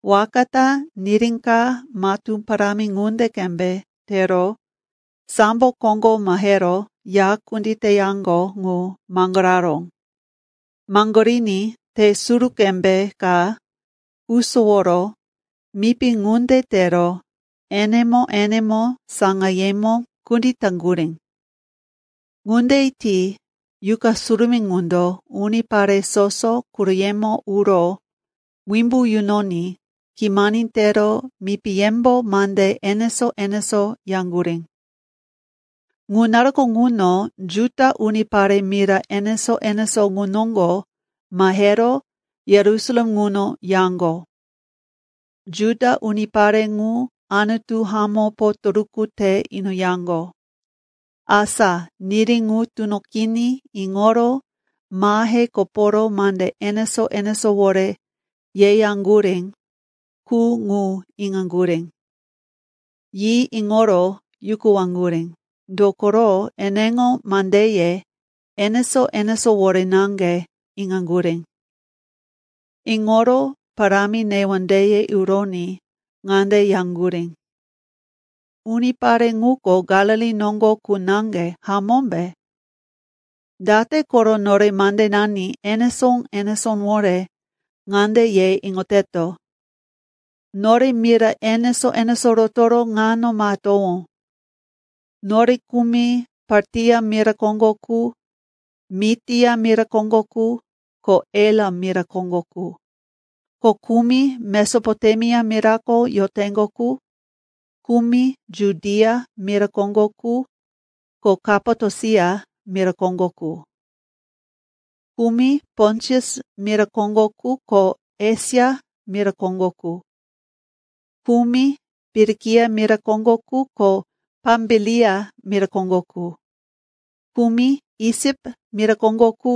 Waka ta niri ka matú parámi ŋunde qembe tero sambo koŋgo mahero ya kunditeyaŋgo ŋu maŋgoraró. Maŋgoriní te suru qembe ka usoworo mipi ŋunde tero enemo-enemo saŋayemo kunditaŋgurí. Ŋunde ti Yuqa Surumí ŋundo unipare soso quroyemo uro wimbu yunoní kimani tero mipiyembo mande enesó-enesó yaŋgurí. Ŋu naruko ŋuno Juda unipare mira enesó-enesó ŋu noŋgo mahero Yerusalem ŋuno yaŋgo. Juda unipare ŋu Anutu hamó potoruku te inoyaŋgo. Asa niri ŋu tunoqiní iŋoro mahe koporo mande enesó-enesówore yeyaŋgurí qu ŋu iŋaŋgurí. Yi iŋoro yukuwaŋgurí, dokoro eneŋo mandeye enesó-enesówore naŋge iŋaŋgurí. Iŋoro parámi newondeye uroní ŋande yaŋgurí, “Unipare ŋuko Galili noŋgo qu naŋge, hamómbe? Date koro nore mandenani enesó-enesówore ŋande ye iŋoteto? Nore mira enesó-enesó rotoro ŋano mahetowó. Nore kumi Partia mira koŋgo qu, Mitia mira koŋgo qu, ko Elam mira koŋgo qu, ko kumi Mesopotemia mirako yoteŋgo qu; kumi Judia mira koŋgo qu ko Kapatosia mira koŋgo qu; kumi Pontus mira koŋgo qu ko Esia mira koŋgo qu; kumi Pirikia mira koŋgo qu ko Pambilia mira koŋgo qu; kumi Isip mira koŋgo qu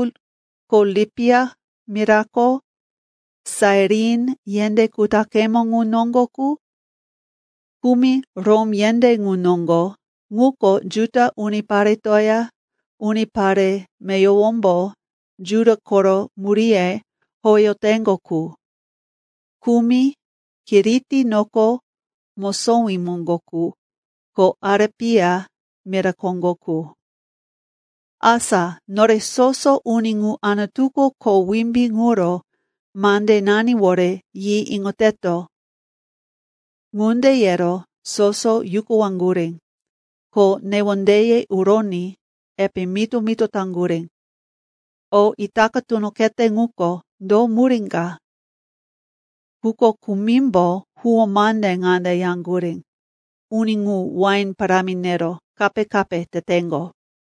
ko Lipia mirako Sairin yendé kutaqemo ŋu noŋgo qu; kumi Rom yendé ŋu noŋgo ŋuko Juda uniparetoya unipare meyowombo Juda koro muríye howeyoteŋgo qu; kumi Kiriti noko mosowí moŋgo qu ko Arepia mira koŋgo qu. Asa nore soso uni ŋu Anutuko kho wimbí ŋuro mandenaniwore yi iŋoteto.” Ŋunde yero soso yukuwaŋgurí, ko newondeye uroní epe mito-mito taŋgurí, “O itaka tunoqete ŋuko, do murí ka?” Quko kumimbo huwó mande ŋande yaŋgurí, “Uni ŋu wain parámi nero kape-kape teteŋgo.”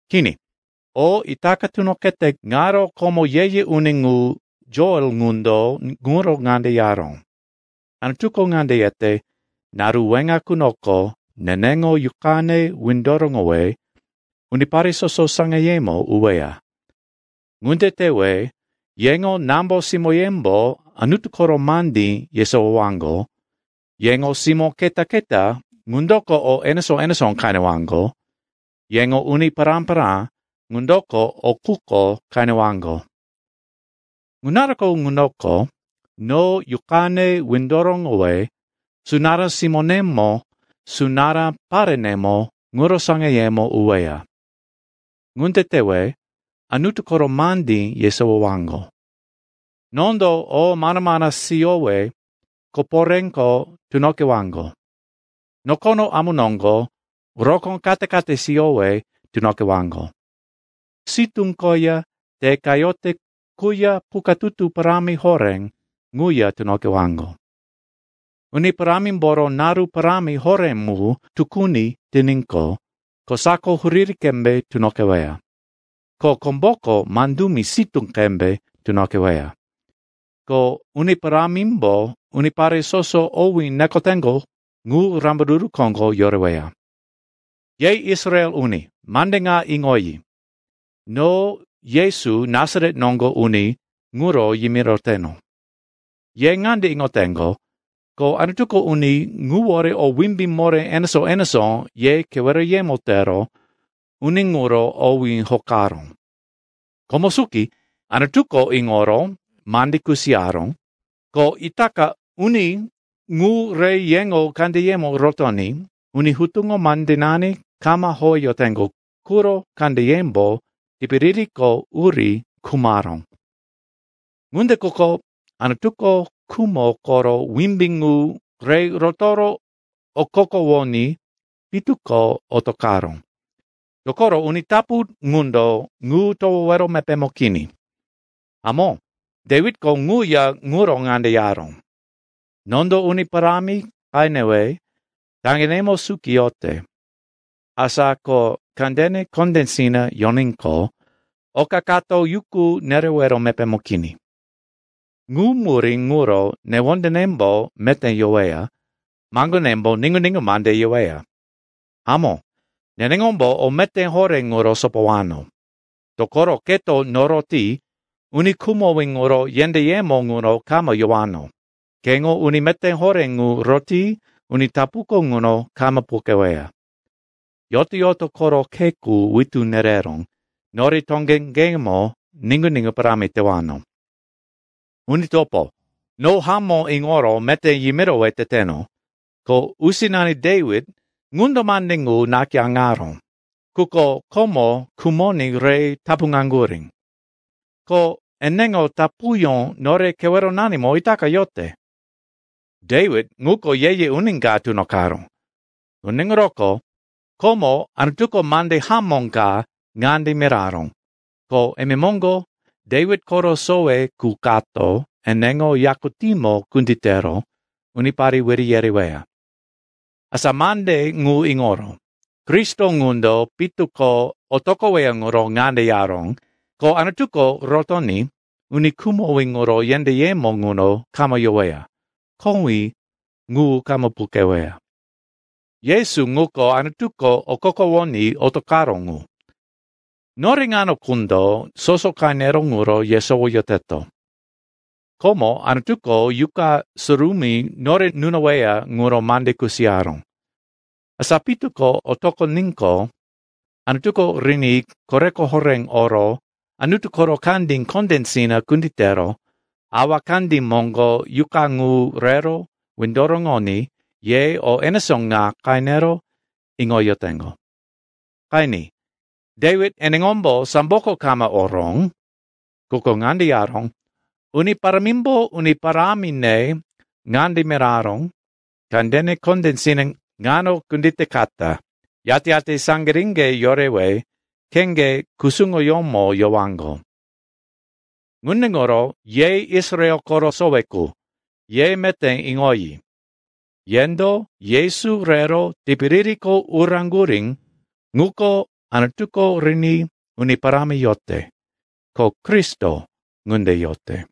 Kini, o itaka tunoqete ŋaro, komo ye-ye uni ŋu Joel ŋundo ŋuro ŋande yaró, “‘Anutuko ŋande yete, “Naru weŋa qunoko neneŋo Yuqane windoroŋowe unipare soso saŋayemo uweya. Ŋunde tewe yeŋo nambo-simóyembo Anutu koro mandí yesowowaŋgo, yeŋo simó keta-keta ŋundoko o enesó-enesó qenewaŋgo, yeŋo uni pará-pará ŋundoko o quko qenewaŋgo. Ŋu naruko ŋunoko no Yuqane windoroŋowe sunará simónemo, sunará parenemo ŋuro saŋayemo uweya. Ŋunde tewe Anutu koro mandí yesowowaŋgo. Nondo o amana-mana siyowe koporéko tunoqewaŋgo. Nokono amu noŋgo rokó kate-kate siyowe tunoqewaŋgo. Sitú koya te qayote quya pukatutu parámi horé ŋuya tunoqewaŋgo. Uni Parámimboro naru parámi horé mu tukuni tiníqo kosako huriri qembe tunoqeweya, ko komboko mandumi sitú qembe tunoqeweya. Ko Uni Parámimbo unipare soso owí nekoteŋgo ŋu rambaruru koŋgo yoreweya.”’ “Ye Israel uni, mande ŋa iŋoyi. No Yesu, Nasaret noŋgo uni ŋuro yimiroteno. Ye ŋande iŋoteŋgo, ko Anutuko uni ŋuwore o wimbí moré enesó-enesó ye keweroyemo tero uni ŋuro owí hokaró. Komo suki Anutuko iŋoro mande kusiyaró, ko itaka uni ŋu re yeŋo kandeyemo rotoní uni hutuŋo mandenani kama howeyoteŋgo quro kandeyembo tipiririko uri khumaró. Ŋunde quko Anutuko khumo koro wimbí ŋu re rotoro okokowoní pitu ko otoqaró. Dokoro uni tapu ŋundo ŋu towowero mepémo kini. Hamó, Dewitko ŋuya ŋuro ŋande yaró, “‘Nondo Uni Parámi qenewe taŋgenemo suki yote. Asa ko kandene kondésina yoníqo oka kato yuku nerewero mepémo kini. Ŋu murí ŋuro newondenembo meté yoweya, maŋgonembo niŋgu-niŋgu mande yeweya. Hamó, neneŋombo o meté horé ŋuro sopowano. Dokoro keto noroti uni khumowí ŋuro yendéyemo ŋuno kama yowano, keŋo uni meté horé ŋu roti uni tapuko ŋuno kama puqeweya. Yoto-yoto koro khe qu witú nereró, nori toŋeŋgemo niŋgu-niŋgu parámi tewano.’ “Uni topo, no hamó iŋoro meté yimirowe teteno, ko usinani Dewit ŋundo mande ŋu nakayáŋaró, quko komo khumoní re tapuŋaŋgurí. Ko eneŋo tapuyó nore keweronanimo itaka yote. Dewit ŋuko ye-ye uni ka tunoqaró. Ŋunde ŋuroko komo Anutuko mande hamó ka ŋande miraró, ko imemoŋgo Dewit koro sowe qu kato eneŋo yakutímo kunditero unipare wiri yereweya. Asa mande ŋu iŋoro Kristo ŋundo pitu ko otoqoweya ŋuro ŋande yaró, ko Anutuko rotoní uni khumowí ŋuro yendéyemo ŋuno kama yoweya, kowí ŋu kama puqeweya. Yesu ŋuko, Anutuko okokowoní otoqaró ŋu. Nore ŋano qundo soso qenero ŋuro yesowoyoteto. Komo Anutuko Yuqa Surumí nore nunoweya ŋuro mande kusiyaró. Asa pitu ko otoqoníqo, Anutuko riní koreko horé oro Anutu koro kandí kondésina kunditero Awa kandí moŋgo Yuqa ŋu rero windoroŋoní ye o enesó ŋa qenero iŋoyoteŋgo. Qeni, Dewit eneŋombo samboko kama oró. Quko ŋande yaró, “‘Uni Parámimbo uni parámine ŋande miraró, “Kandene kondésina ŋano kunditekata, yate-yate saŋgiríŋge yorewe kheŋge kusuŋoyómo yowaŋgo.”’ “Ŋunde ŋuro ye Israel koro sowe qu, ye meté iŋoyi. Yendo Yesu rero tipiririko uraŋgurí ŋuko, Anutuko riní Uni Parámi yote; ko Kristo ŋunde yote.”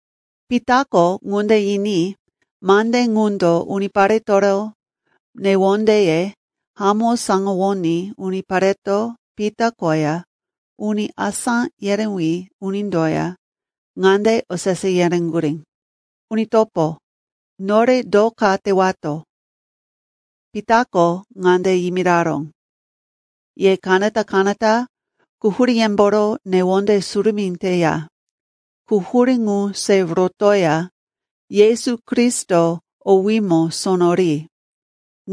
Pitako ŋunde yiní mande ŋundo uniparetoro newondeye hamó saŋgawoní unipareto Pita koya uni asá yerewí unindoya ŋande osese yereŋgurí, “Uni topo, nore do ka tewato?” Pitako ŋande yimiraró, “Ye kanata-kanata quhuríyemboro newonde surumí teya quhurí ŋu se rotoya Yesu Kristo owímo sono ri.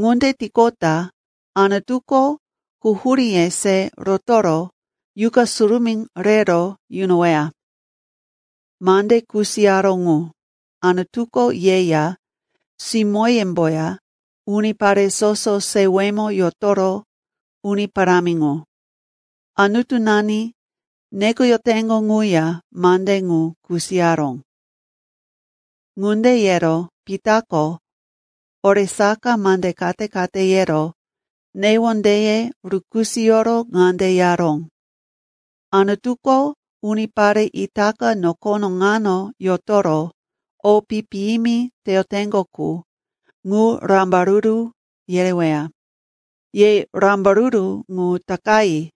Ŋunde tiqota Anutuko quhuríye se rotoro Yuqa Surumí rero yunoweya. Mande kusiyaró ŋu, Anutuko yeya, simóyemboya, unipare soso sewemo yotoro Uni Parámi ŋu, Anutunani nekoyoteŋgo ŋuya mande ŋu kusiyaró.” Ŋunde yero Pitako oresaka mande kate-kate yero newondeye rukisoyoro ŋande yaró, “Anutuko unipare itaka nokono ŋano yotoro o pi-piyimi teyoteŋgo qu, ŋu rambaruru yereweya. Ye rambaruru ŋu takayi!”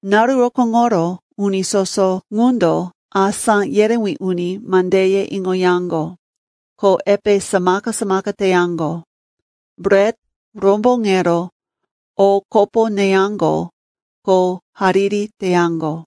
Naru rokóŋoro uni soso ŋundo asá yerewí uni mandeye iŋoyaŋgo, ko epe samaka-samaka teyaŋgo, bret romboŋero o kopo neyaŋgo ko hariri teyaŋgo.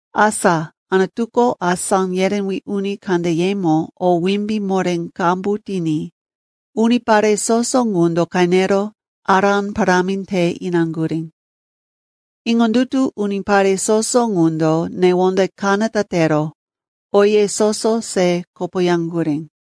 Asa Anutuko asá yerewí uni kandeyemo o wimbí moré qambu tiní unipare soso ŋundo qenero ará parámi te inaŋgurí. Iŋondutu unipare soso ŋundo newonde kanata tero oye soso se kopoyaŋgurí.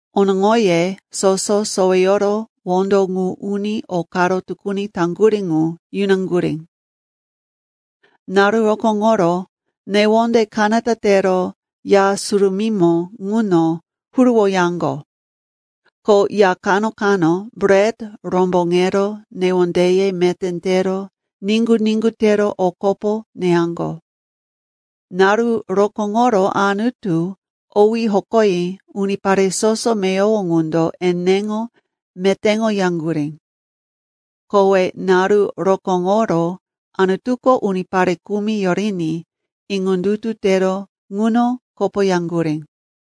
Onoŋoye soso soweyoro wondo ŋu uni o karo tukuni taŋgurí ŋu yunaŋgurí. Naru rokóŋoro newonde kanata tero Ya Surumímo ŋuno huruwoyaŋgo, ko ya kano-kano bret romboŋero newondeye meté tero niŋgu-niŋgu tero o kopo neyaŋgo. Naru rokóŋoro Anutu owí hokoyi unipare soso meyowo ŋundo eneŋo metéŋoyaŋgurí. Kowe naru rokóŋoro Anutuko unipare kumi yoriní iŋondutu tero ŋuno kopoyaŋgurí.